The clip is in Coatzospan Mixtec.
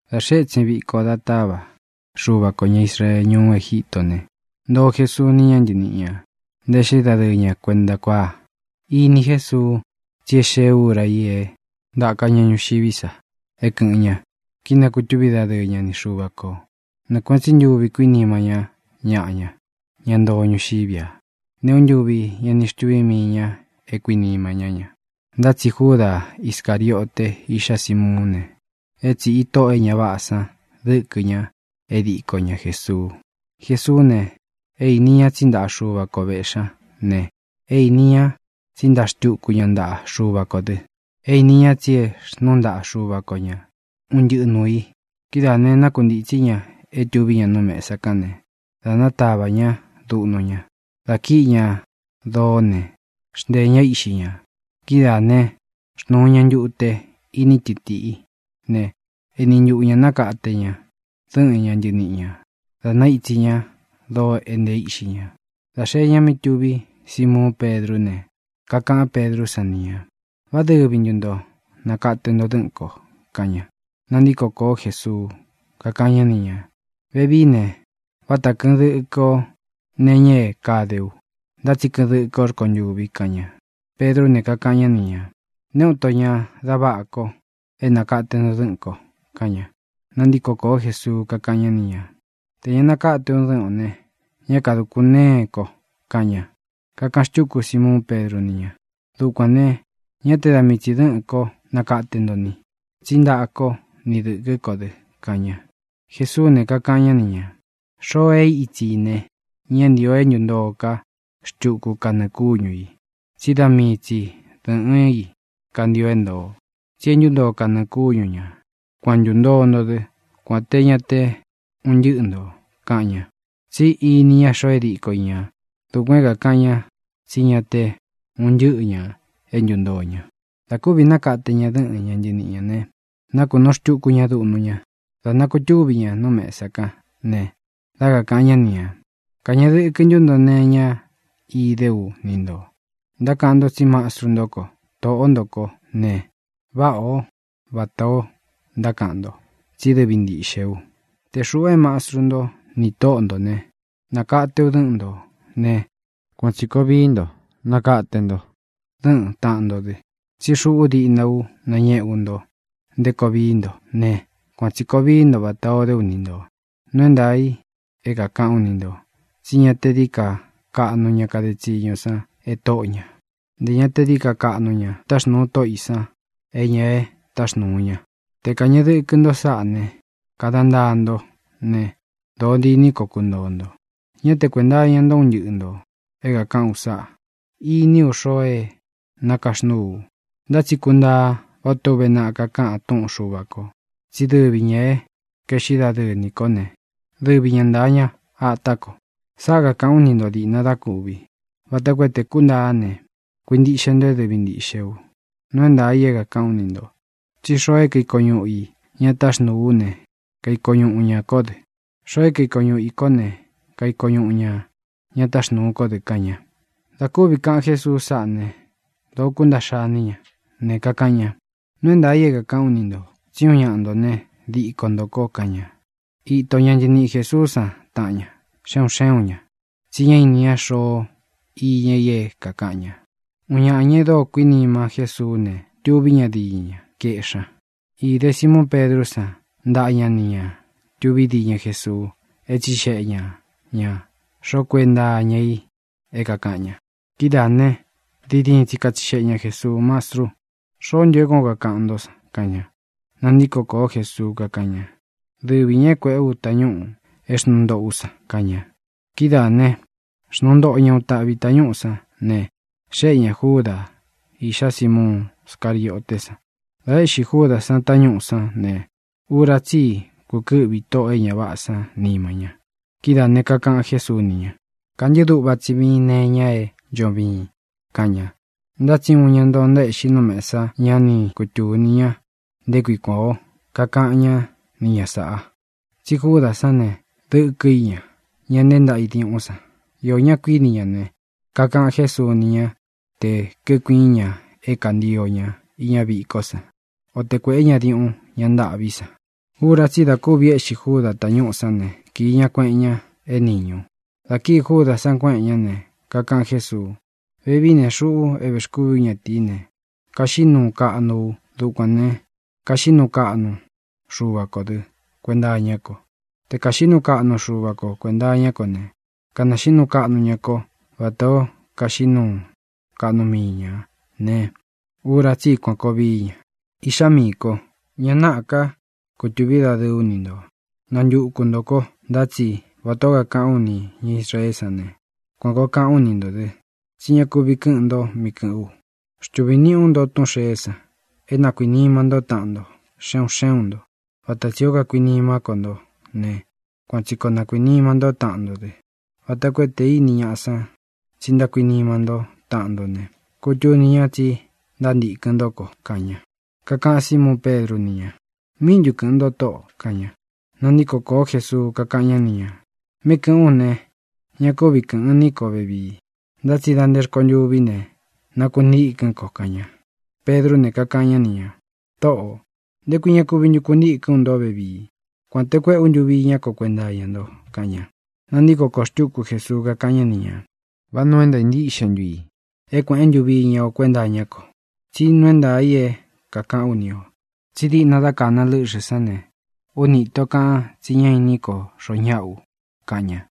Dā xee étsin viko da táva Xuva kō ña Israee ñuú Egítō ne, ntoo Jesuu ni ña ntɨníꞌi ñā, ntaéꞌxi dadɨɨ ña kuenta kuáa. Ini Jésuu tsí e xée ūra i é ntāka ña ñuxiví sa é kɨ̄ꞌɨn ña, kínakūtúvi dadɨɨ́ ña ni Xuva kō. Nɨɨ kuēꞌen tsí ntuvi kuínima ñá ñaꞌa ña, ña ntoo ñuxiví a. Nté uun ntūvi ñá ni xtuví mii ñā é kuinima ñá ña. Ntá tsi Júda Iscāriote, iꞌxá Simuún ne, é tsīꞌi tóꞌō e ña váꞌā san dɨ́kɨ ña é diko ña Jēsuu. Jesuú ne, é īni ña tsí ntaꞌa Xuva ko vēꞌxí ña ne, é īni ña tsí ntaa xtuku ña ntaꞌa Xuva kō dɨ. E īni ña tsí e xnúu ntaꞌa Xuva ko ña un ntɨꞌɨ nūu i. Kidáā ne, nákuntītsí ña é tuví ña nú mēsa kán ne, dā nátavā ñá duꞌnu ña, dā kíꞌi ña doó ne, xnteē ñá íꞌxi ñā. Kidáā né, xnūu ña ntute ini tɨtiꞌí ne, éni ntuꞌu ñā nákate ña dɨ́ꞌɨn ña ntɨniꞌi ñā, da naítsi ñá doo é ntee íꞌxi ña. Dā xee ña mí tuví Simuun Pedrú ne, kakaꞌán Pedrú san ni ñā: —¿Vá dɨvi ntu nto nākate nto dɨ́ꞌɨ̄n ko? —kaꞌan ña. Nantíko kōó Jesuu, kakáꞌan ñá ni ñā: —Vevií ne, váta kɨ̄ꞌɨn dɨkɨ o nee iña é kade u. Ntá tsi kɨꞌɨn dɨkɨ o rkontûvi —kaꞌan ña. Pedrú ne, kakaꞌan ñá ni ñā: —¡Nté uun ito ña da váꞌa ko é nakate nto dɨ́ꞌɨ̄n ko! —kaꞌan ña. Nantíko kōó Jesuu, kakáꞌan ñá ni ñā: —Tē ña nakáte ú dɨ́ꞌɨn ō ne, ñá kadūkun ntéen ko —kaꞌan ña. Kakaꞌan xtúku Simuún Pedru ni ña: —¡Dukuān ne, ñá te da mii tsi dɨ̄ꞌɨ́n ko nakate nto ni; tsí ntaꞌa kó ni dɨ̄kɨ́ ko dɨ! —kaꞌan ña. Jesuú ne, kakaꞌan ñá ni ñā: —Xoo e ítsi i ne, ñá ntīo é ntuntoo ká xtuku kanɨɨ̄ kúñu ī, tsí da mii tsi dɨ́ꞌɨn ī kantio é ntōo. Tsi e ntúntoo kanɨɨ̄ kúñu ñā. Kuan ntūntoo nto dɨ́, kuān té ña te un ntɨ́ꞌɨ ntō —kaꞌan ña. Tsí ini ña xoo é diko i ñā. Dukuān é kakaꞌan ña tsí ña te un ntɨ́ꞌɨ ñā e ntúntoo ña. Dā kúvī nákate ña dɨ́ꞌɨn ña ntɨniꞌi ñā ne, nákunūu xtuku ña duꞌnu ña. Dā nakutúvi ña nú mesa kán ne, dá kakāꞌan ñá ni ñā: —¿Kañeꞌe dɨkɨ ntú nto nee iña idé u ni ntō? Ntákaꞌan nto tsí mastru ntó ko, tōꞌó nto kó ne, váꞌā ó vatā o ntákaꞌan nto, tsí dɨvi ntīꞌxe u. Te xūꞌu é mastru ntó nī tóꞌo ntō ne, nakate ú dɨ́ꞌɨn ntō né, kuan tsī koo vií nto, nakate nto dɨ́ꞌɨn tāꞌan nto dɨ. Tsí xuꞌu díꞌna ú nañēꞌe ú nto nté koo vií nto ne, kuan tsī koo vií nto vatā o dé u ni ntō. Nuu é ntaā i é kākaꞌán u ni ntō tsí ña te dií ka kaꞌnu ña kade tsiñu san e tóꞌo ñā. Ntē ña te dií ka kaꞌnu ña táxnūu tóꞌo ī san é ña e táxnūu ña. Te kāñeꞌe dɨkɨ nto sáꞌa ne, kada ntaa ntó ne, dōo diní koo kuntōo nto. ʼÑá te kuēnta iña nto un ntɨ́ꞌɨ ntō é kākaꞌán u sáꞌa. Iní u xoo é nakaxnúu u. Ntá tsi kuntaa vatā o úve naꞌa kakáꞌan túꞌun Xuva kō tsi dɨ́vi ñā é kaeꞌxí dadɨɨ nī kó ne, dɨvi ña ntāa ña atá ko. Sáꞌa kākaꞌán u ni ntō diꞌna da kúvi, vata koo te kúntaá ne, kuintiꞌxe nto é dɨvi ntīꞌxé u. Nuu é ntaā i é kākaꞌán u ni ntō tsí xoo é kaiko ñúꞌu i ña táxnūu ú ne, kaiko ñúꞌu ña kó dɨ; xoo é kaiko ñuꞌu i kó ne, kaiko ñuꞌu ña ña táxnūu kó dɨ —kaꞌan ña. Dā kúvi kaꞌan Jésuu sáꞌa ne, dōó kuntaꞌxa iní ña ne, kakaꞌan ña: —Nuu é ntaā i é kākaꞌán u ni ntō: Tsí uun ñaꞌa nto ne, diko ntō ko —kaꞌan ña. Ito ña ntɨniꞌi Jēsuú san taꞌan ña, xe un xé un ñā, tsi ñá ini ña xoo iña i é kākaꞌan ña. Uun ñaꞌa ñā e dóo kuinima Jésuú ne, tuví ña diñɨ ña, kaeꞌxí ña. Īde Simuún Pedrú san ntaꞌa ña nī ña tuví diñɨ Jesuu é tsixeꞌe ña ñā xoó kuenta iña í é kākaꞌan ña. Kidáā ne, diin diin tsi katsixeꞌe ña Jēsuu: —Mastru, ¿xoó ntu é kuān ó kakaꞌan ntó san? —kaꞌan ña. Nantíko kōó Jesuu, kakáꞌan ña: —Dɨvi ñā é kuēꞌé u tañúꞌū é xnūu ntoꞌo ú san —kaꞌan ña. Kidáā né, xnuu ntoꞌo ña uun taꞌvī tañúꞌū sán ne, xéꞌe ñā Júdā, iꞌxá Simuun Scarioté san. Dā éꞌxi Júdā san tañúꞌu sán ne, ura tsí i kukɨ́ꞌvi tóꞌō e ña váꞌā sán nima ña. Kidáā ne, kakaꞌan Jésuu ni ña: —Kantɨ́ꞌɨ dúꞌva tsi viin nee iña é ncho viin —kaꞌan ña. Ntá tsi nté uun ña ntoo ntaéꞌxi nú mesá san ña ni kutúni ña nté kui kuān ó kakaꞌan ñá ni ña sāꞌa. Tsi Júdā sán ne, dɨ́kɨ i ña, ña nteé ntaꞌa i diúꞌun san. Iō ñá kuiní ña ne, kakaꞌan Jésuu ni ñá tē kíkuiín ña é kantio ña iña vikó san, o te kuēꞌé ña diuꞌun ña ntâꞌví san. Ura tsí i da kúvi éꞌxi Júdā tañúꞌū sán ne, kīi ña kueꞌen ña é nīñu. Dā kíi Júdā san kuéꞌen ñá ne, kakaꞌan Jésuu: —Vevií ne, xuꞌu é vēxkúvi ú ñatīí ne, kaxiꞌí nuu kaꞌnu u. Dukuān ne, kaxiꞌí nuu kaꞌnu Xuva kō dɨ́ kuenta iñá ko. Te kāxiꞌí nuu kaꞌnu Xuva ko kuēnta iñá ko ne, kanaxiꞌí nuu kaꞌnu ña kó vatā ó kaxiꞌí nuu kaꞌnu mii ñā ne, ura tsí i kuan kōo vií ña. Iꞌxá miī kó, ña náꞌā ká kutuví dadɨɨ ú ni ntō. Nantuku ntō ko, ntá tsi, vatā ó kakaꞌán u nī ña Israeé san ne, kuan kōo kaꞌán u ni ntō dɨ tsí ña kuvi kɨ́ꞌɨn ntō mí kɨ̄ꞌɨ́n u. Xtuvī niꞌí u nto túꞌūn xeé san: é na kuīnima ntó taꞌan nto, xe un xé un ntō. Vata tsī ó kakuinimá ko nto ne, kuan tsi koo na kuīnima ntó taꞌan nto dɨ́, vata koo tē íni ñaꞌa san tsi ntákuinima ntó taꞌan nto ne, kutuni ña tsi ntántīkɨn ntó ko —kaꞌan ña. Kakaꞌan Símuun Pedru ni ña: —¿Míꞌi ntu kɨ̄ꞌɨn nto, Tóꞌō? —kaꞌan ña. Nantíko kōó Jesuu, kakáꞌan ñá ni ñā: —Mí kɨ̄ꞌɨ́n u ne, ña kúvi kɨ̄ꞌɨn ní ko vevii, ntá tsi da nté rkontûví ne, nakuntîkɨ́n ko —kaꞌan ña. Pedrú ne, kakaꞌan ñá ni ñā: —Tōꞌó, ¿nté kui ña kuvi ntu kuntikɨ́n u nto vevii? ¡Kuān te kuéꞌe ú ntuvi iñá ko kuenta iña nto! —kaꞌan ña. Nantíko kōo xtúku Jesuu, kakáꞌan ñá ni ñā: —¿Vá nuu é ntāa ntíꞌxe ntu i é kuēꞌen ntuvi iña o kuénta iñá ko? Tsí nuu é ntaā i é kākaꞌán u ni ō tsí diꞌna dá kāna lɨ́ꞌxɨ̄ sán ne, úni īto kaꞌan tsi ñá inín ko xoo ñáꞌa u —kaꞌan ña—.